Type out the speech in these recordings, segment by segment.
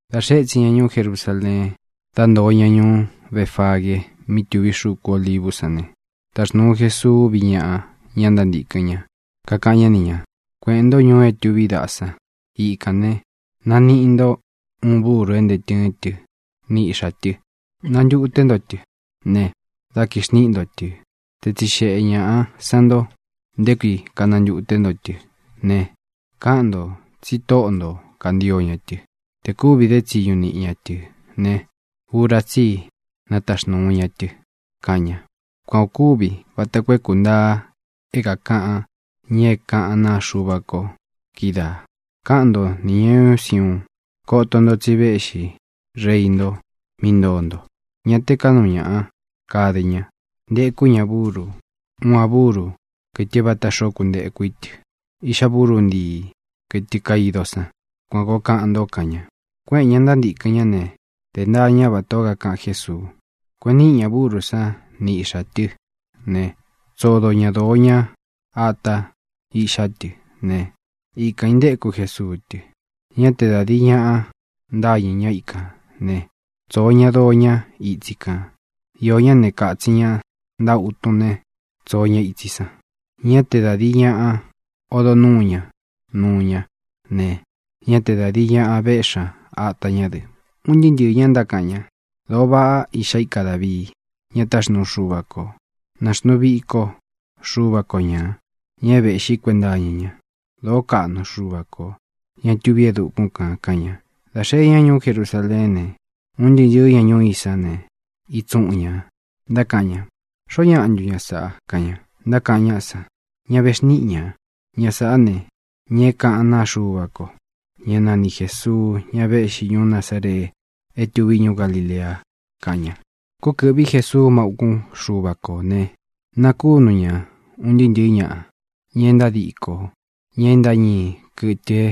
Dā xee étsin ña ñuú Jerusāleen, dá ntoo ña ñuú Befagee mí tuví xuku Olivú san ne, taxnūu Jesuu úvi ñaꞌa ña ntántīkɨn ña, kakaꞌan ñá ni ñā: —Kueꞌēn ntó ñuu é tuví daꞌa san. Ikān ne, naniꞌi nto uun búru é ntee tɨ́ɨn tɨ ni iꞌxā tɨ. Nantuté nto tɨ ne, dá kixniꞌi nto tɨ̄. Te tsixeꞌe ñāꞌa san nto nté kui kánantute nto tɨ́ ne, káꞌan ntō tsi tóꞌo nto kāntio ña tɨ. Tē kúvi dé tsiñu niꞌi ña tɨ ne, ura tsí i nataxnūu ña tɨ —kaꞌan ña. Kuan ō kúvi vata koo é kūntaa é kākaꞌan ña é kaꞌán naa Xuva ko kídaā: Káꞌan nto nī ña ñuú Siuun: “Koto nto, tsi véꞌxi reí nto mí ntoo nto. Ñá te kāꞌnu ñaꞌa kade ña; ntekú ña buru, uun a búru, kɨtɨ é vāta xoo kuntéku í tɨ, iꞌxá buru ntíi, kɨtɨ kaido san.” Kuan kōo kaꞌan nto, kaꞌan ña. Kuéꞌēn ña ntántīkɨn ñá ne, de ntaa ña vatā ó kakaꞌan Jésuu. Kueꞌen níꞌi ña būrú san ni iꞌxā tɨ́ ne, tsodo ña dōo ña áta iꞌxá tɨ ne, ikān intéku Jesuu tɨ. Ñá te da dīi ñaꞌa ntáñɨ̄ ñá ikān né, tsōo ña doo ñá itsi kān. Iō ñá ne, katsin ña ntáꞌa utun ne, tsoo ña itsi san. Ñá te da dīi ñaꞌa odo nuú ña nuu ñá ne, ñá te da dīi ñaꞌa véꞌxi ña atā ñá dɨ. Un ntɨɨ́ ntɨɨ̄ ña ntákaꞌan ña: —¡Dōo váꞌa Iꞌxá ika Dāvii, ña táxnuu Xuva kō! ¡Na xnuu viko Xuva ko ñā, ña é vēꞌxí kuenta iña ña! ¡Dōo káꞌnu Xuva kō, ña tuví e dukún kān! —kaꞌan ña. Dā xee ñá ñuú Jerusaleén ne, un ntɨɨ́ ntɨ̄ɨ́ ña ñuú i san ne, itsuꞌun ñā, ntákaꞌan ña: —¿Xoó ñaꞌa ntu ña sāꞌa? —kaꞌan ña. Ntákaꞌan ñáꞌa san, ña vexníꞌi ña: —Ña sāꞌá ne, ña é kākaꞌán naa Xuva ko, ñá nani Jēsuu, ñá vēꞌxi ñuú Nazaree é tuví ñuú Galilea —kaꞌan ña. Kúkɨ̄ꞌví Jesuu má ūkún Xuva kō ne, nakúnu ña ūn ntɨɨ́ ntɨ̄ɨ́ ñaꞌa, ña e ntádikō, ña e ntáñii kɨtɨ é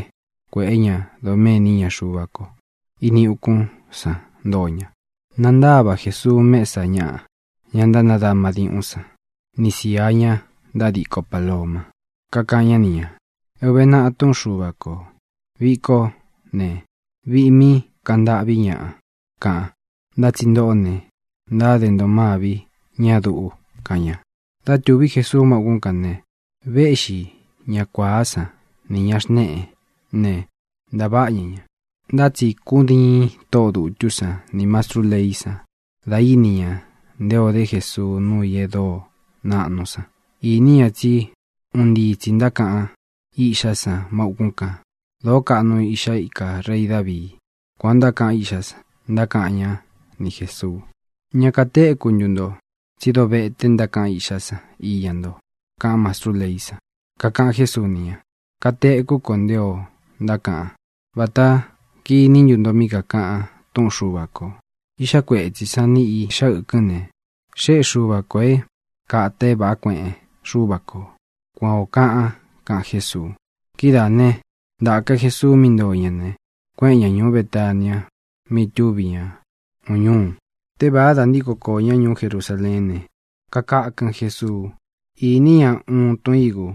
kuēꞌé ña doméni iña Xuva ko. Ini ukún san ntoo ña. Nantáva Jēsuu mesa ñáꞌa, ña ntánadama diuꞌún san, ni sīa ña ntádiko pāloma. Kakaꞌan ñá ni ñā: —É ūve naꞌa túꞌun Xuva kō: “Viꞌi kó ne, viꞌi mí kaꞌan ntâꞌví ñaꞌa”, kaꞌan. Ntá tsi ntōꞌó ne, ntáde nto mâvi ñá duꞌu —kaꞌan ña. Dá tūví Jesuu má ūkún kān ne, véꞌxi ña kuāá san nī ña xneꞌé ne, ntāváꞌa ña ña. Ntá tsi kúdiin tóꞌō dutú san nī mastrú leí san dā íni ña nté ō dé Jesuu nuu i e dóo naꞌnu san. Īní ña tsí un ntii tsī ntákaꞌan iꞌxá san má ūkún kān: “¡Dōó kaꞌnu Iꞌxá ika rei Dāvii!” Kuān o ntákaꞌan iꞌxá san. Ntákaꞌan ñá ni Jēsuu: —¿Ña katéku ntu nto tsí dovéte ntákaꞌan iꞌxá san iña nto? —kaꞌan mastrú leí san. Kakaꞌan Jésuu ni ña: —Katekú ko nté ō ntákaꞌan. Vāta kiní ntu nto mí kakāꞌan túꞌun Xuva kō: Iꞌxá kuetsī sán ni īꞌxá ɨkɨn ne, xéꞌe Xuva kō é kāta é vāꞌá kueꞌen Xúva kō. Kuan ō kaꞌan —kaꞌan Jésuu. Kidáā né, ntāka Jesuu mí ntoo ña ne, kuéꞌen ña ñūú Betania mí itúvi ña uun ñúu. Tévāá, dā ntíko kōo ñá ñuú Jerusaleén ne, kakakɨn Jesuu. Īní ña uun tun ígu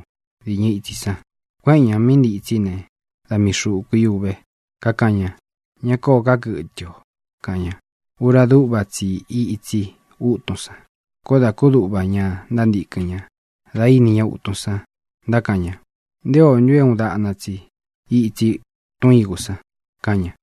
dīñɨ itsi san. Kuéꞌen ñā mí ntitsí ne, da mii xūku í uve. Kakaꞌan ña: —¡Ña kóō ká kɨtɨ o! —kaꞌan ña. Ura dúꞌva tsi i ítsi ūtun san. Koó dā kúduꞌva ña ntántīkɨn ña da íni ña utun san. Ntákaꞌan ña: —¿Nté ō ntu é uun daꞌna tsi ítsi tun ígū san? —kaꞌan ña.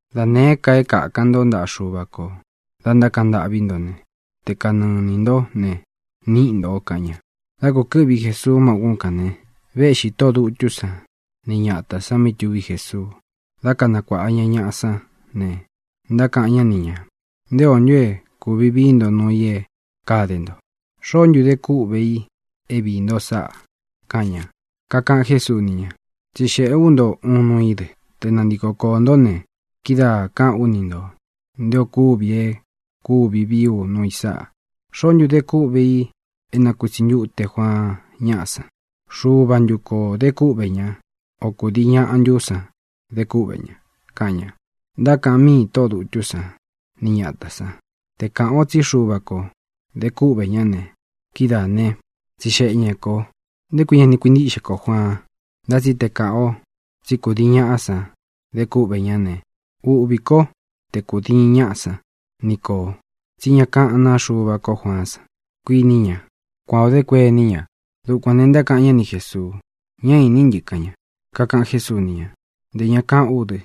Da nēé ka é kakan ntó ntaꞌa Xuva kō dá ntákaꞌan ntâꞌví nto ne, te kanɨɨ inī ntó ne, níꞌi ntō —kaꞌan ña. Dá kūkɨ́ꞌvi Jesuu má ūkún kān ne, véꞌxī tóꞌō dutú san ni ñatā san mí tuví Jesuu dá kanakuāꞌa ña ñaꞌa sán ne, ntákaꞌan ñá ni ñā: —¿Nté o ntu é kūvi vií nto nuu i é kade nto? ¿Xoó ntu de kúꞌvē i é viī nto sáꞌā? —kaꞌan ña. Kakaꞌan Jésuu ni ña: —Tsixēꞌé u nto uun nuu í dɨ. Te nantiko koō ntó ne, kidáa kāꞌán u ni ntō nté ō kúvi é kūvi vií u nuu i sáꞌa. ¿Xoó ntu de kúꞌvē i é nakūtsi ntute Juaan ñáꞌa san? ¿Xuva ntu kō de kúꞌvē ñá, o kūdii ñaꞌa ntú san de kúꞌvē ña? —kaꞌan ña. Ntákaꞌan míi tóꞌō dutú san ni ñatā san: —Te kāꞌan o tsí Xuva kō de kúꞌvē ñá ne, kidáā ne, tsixeꞌe ña kō nté kui ña ni kuintíꞌxe kō Juaan. Ntá tsi te kāꞌan o tsí kūdii ñaꞌá san de kúꞌvē ñá ne, uꞌvī kó te kūdiin ñaꞌá san ni kō tsí ñá kaꞌán naa Xuva kó Juaán san, kuiní ña —kuan ō dé kuení ña. Dukuān ne, ntákaꞌan ñá ni Jēsuu: —Ñá iní ntɨ —kaꞌan ña. Kakaꞌan Jésuu ni ña: —Ntē ña kaꞌán u dɨ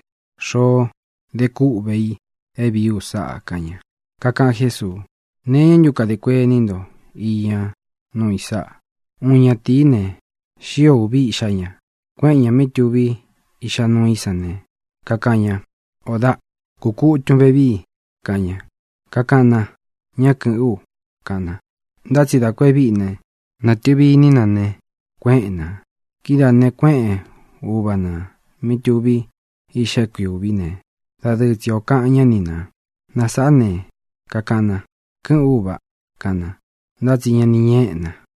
xoó de kúꞌvē i é vīí u sáꞌā —kaꞌan ña. Kakaꞌan Jésuu: —¿Nee iñá ntu kadē kuení nto iña nuu i sáꞌa? Uun ñatīí ne, xío ūvi iꞌxá ña. Kuéꞌen ñā mí tuví iꞌxá nuu í san ne, kakaꞌan ña: “Ō daꞌ, kukutun vevíi”, kaꞌan ña. Kakaꞌan na: “Ñá kɨ̄ꞌɨ́n u”, kaꞌan na. Ntá tsi dā ku e víꞌi ne, nātɨvi iní na ne, kuéꞌen nā. Kidáā ne, kuéꞌen uva nā mí tuví iꞌxa é kui ūví ne, dadɨɨ tsi o kakaꞌan ñá ni nā. Na sāꞌá ne, kakaꞌan na: “Kɨ́ꞌɨ̄n ú, ūva”, kaꞌan na, ntá tsi ña ni ñéꞌe na.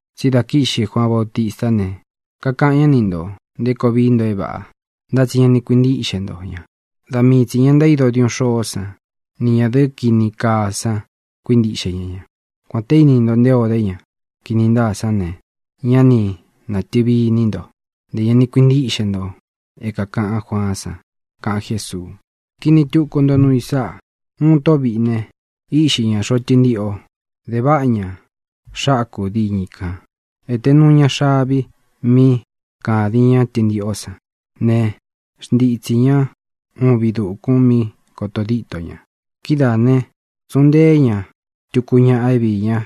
Tsi dá kīꞌxi Juaan Bautistá ne, kakaꞌan ñá ni ntō nté koo vií nto é vāꞌa, ntá tsi ña ni kuintíꞌxe nto ña. Da mii tsī ña ntaído diuꞌun xôó san ni ñadɨ̄ꞌɨ kini kaa san kuíntiꞌxe ña ña. Kuān te íni nto nté ō dé ña kini ntáa san ne, ñá ni nātɨvi iní nto, ntē ña ni kuintíꞌxe nto é kākaꞌan Juaán san —kaꞌan Jésuu—. ʼKini tuku nto nuu i sáꞌa. Uun tóꞌo vīꞌi ne, íꞌxi ñā xoꞌo tɨntiꞌo. De váꞌa ña xaku diñɨ i kān. Ēte nuu ña xavi mí kādin ñá tɨntiꞌó san ne, xntitsī ñá uun viꞌi dūkun mí kotō dítō ña. ʼKidáā ne, tsuꞌun nteé ña tuku ñaꞌa é viī ñá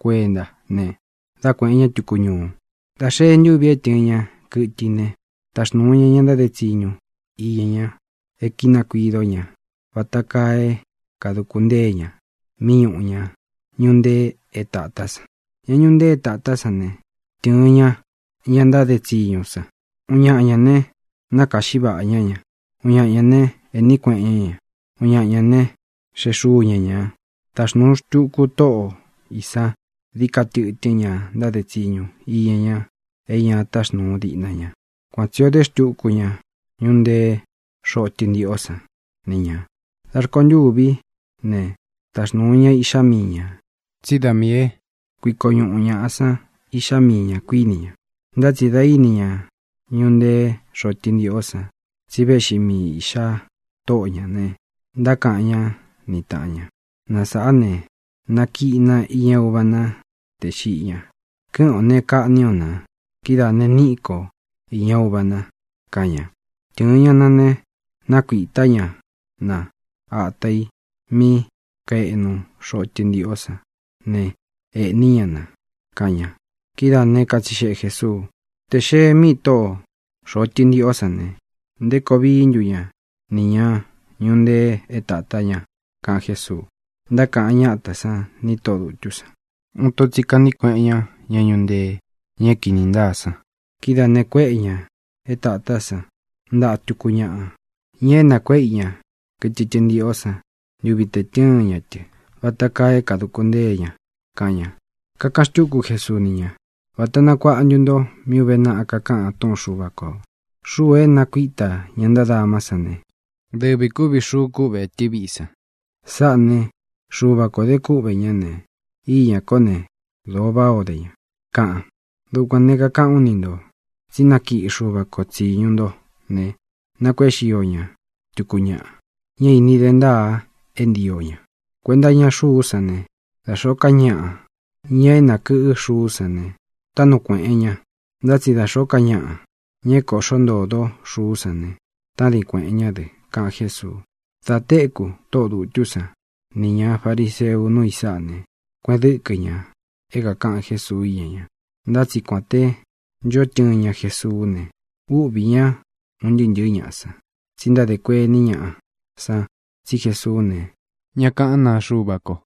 kuentá ne, dá kueꞌēn ñá tuku ñuu. Dā xee ntúvi é tɨ̄ɨn ña kɨtɨ i ne, taxnūu ña ña ntáde tsiñu iña ña e kínakuido ñá vata kaa é kāduku ntée ña mí ñūꞌu ña ñuꞌu ntee é tātá san. Ña ñuꞌu ntee é tātá san ne, tɨ̄ɨn ña ña ntáde tsiñu san. Uun ñaꞌa ñā né, nákāꞌxí vaꞌa ñá ña. Uun ña ne, ēꞌní kueꞌen ñá ña. Uun ña ne, xeꞌe xúu ña ñā. Taxnūu xtuku tóꞌo ī sán dií ka tɨtɨ́n ña ntáde tsiñu iña ña e ña táxnūu diꞌna ña. Kuan tsi ō dé xtuku ña ñuꞌu nteé xoꞌo tɨntiꞌó san ni ñā. ʼDa rkontûví ne, taxnūu ña iꞌxá mii ñā, tsí da miī é kuiko ñūꞌu ñaꞌa san iꞌxá mii ña, kuíni ña. Ntá tsi dā íni ña ñuꞌu ntee xoꞌo tɨntiꞌó san tsi véꞌxi mii īꞌxa tóꞌo ñā ne, ntákaꞌan ñá ni tāꞌan ña: “Na sāꞌá ne, na kiꞌi na iña uva na tē xiꞌi ña. Kɨ́ꞌɨn ō ne, kaꞌní o nā. Kidáā ne, níꞌi ko īña uva na”, kaꞌan ña. Tɨ̄ɨn ña na ne, nákuitā ñá na ata ī mí kaeꞌnu xoꞌo tɨntiꞌó san ne, eꞌní ña na —kaꞌan ña. Kidáā né, katsixeꞌe Jēsuu: —Tē xee míi tóꞌō xoꞌo tɨntiꞌó san ne, ¿nté koo vií ntu ña nī ña ñuꞌu ntee é tatā ña? —kaꞌan Jésuu. Ntákaꞌan ñátā san ni tóꞌō dutú san: —Uun ito tsi kaꞌní kueꞌen ña ña ñuꞌu ntee, ña é kīni ntáa san. Kidáā ne, kuéꞌe ñā é tātá san ntaꞌa tuku ñaꞌa, ña é nakuéꞌe i ña kɨtɨ tɨntiꞌó san ntuvi te tɨ̄ɨn ña tɨ, vata kaa é kāduku ntée ña —kaꞌan ña. Kakaꞌan xtúku Jesuu ni ña: —Vāta nakuaꞌa ntu nto mí ūve naꞌa kakaꞌan túꞌun Xuva kō: Xuu é nakuītá ña ntádamá san ne, dɨvi kūvi xuu kuꞌve etɨ́ viꞌi san. Sáꞌā né, Xuva kō de kúꞌvē ñá ne, íña kō né, dōo váꞌā o dé ña, kaꞌan. Dukuān ne, kakaꞌán u ni ntō tsí nakiꞌi Xuva ko tsīñu nto ne, nakuéꞌe xio ña tuku ñaꞌa, ña é īni de ntáa é ntio ña. Kuenta iña xuú san ne, da xōó ka ñaꞌa, ña é nākɨꞌɨ́ xuú san ne, táꞌnu kueꞌen ñā. Ntá tsi da xōó ka ñaꞌa, ña é kōꞌxó ntōdó xuú san ne, tádin kuēꞌen ñá dɨ —kaꞌan Jésuu. Dā téku tóꞌō dutú san nī ña fariseu núu i sáꞌa ne, kueꞌen dɨ́kɨ ña é kākaꞌan Jésuu íña ña. Ntá tsi kuān té ncho tɨɨn ña Jesuú ne, úꞌvī ñá un ntɨɨ́ ntɨ̄ɨ́ ñaꞌa san, tsi ntádē kuení ñaꞌa san tsí Jesuú ne, ñá kaꞌán naa Xuva ko.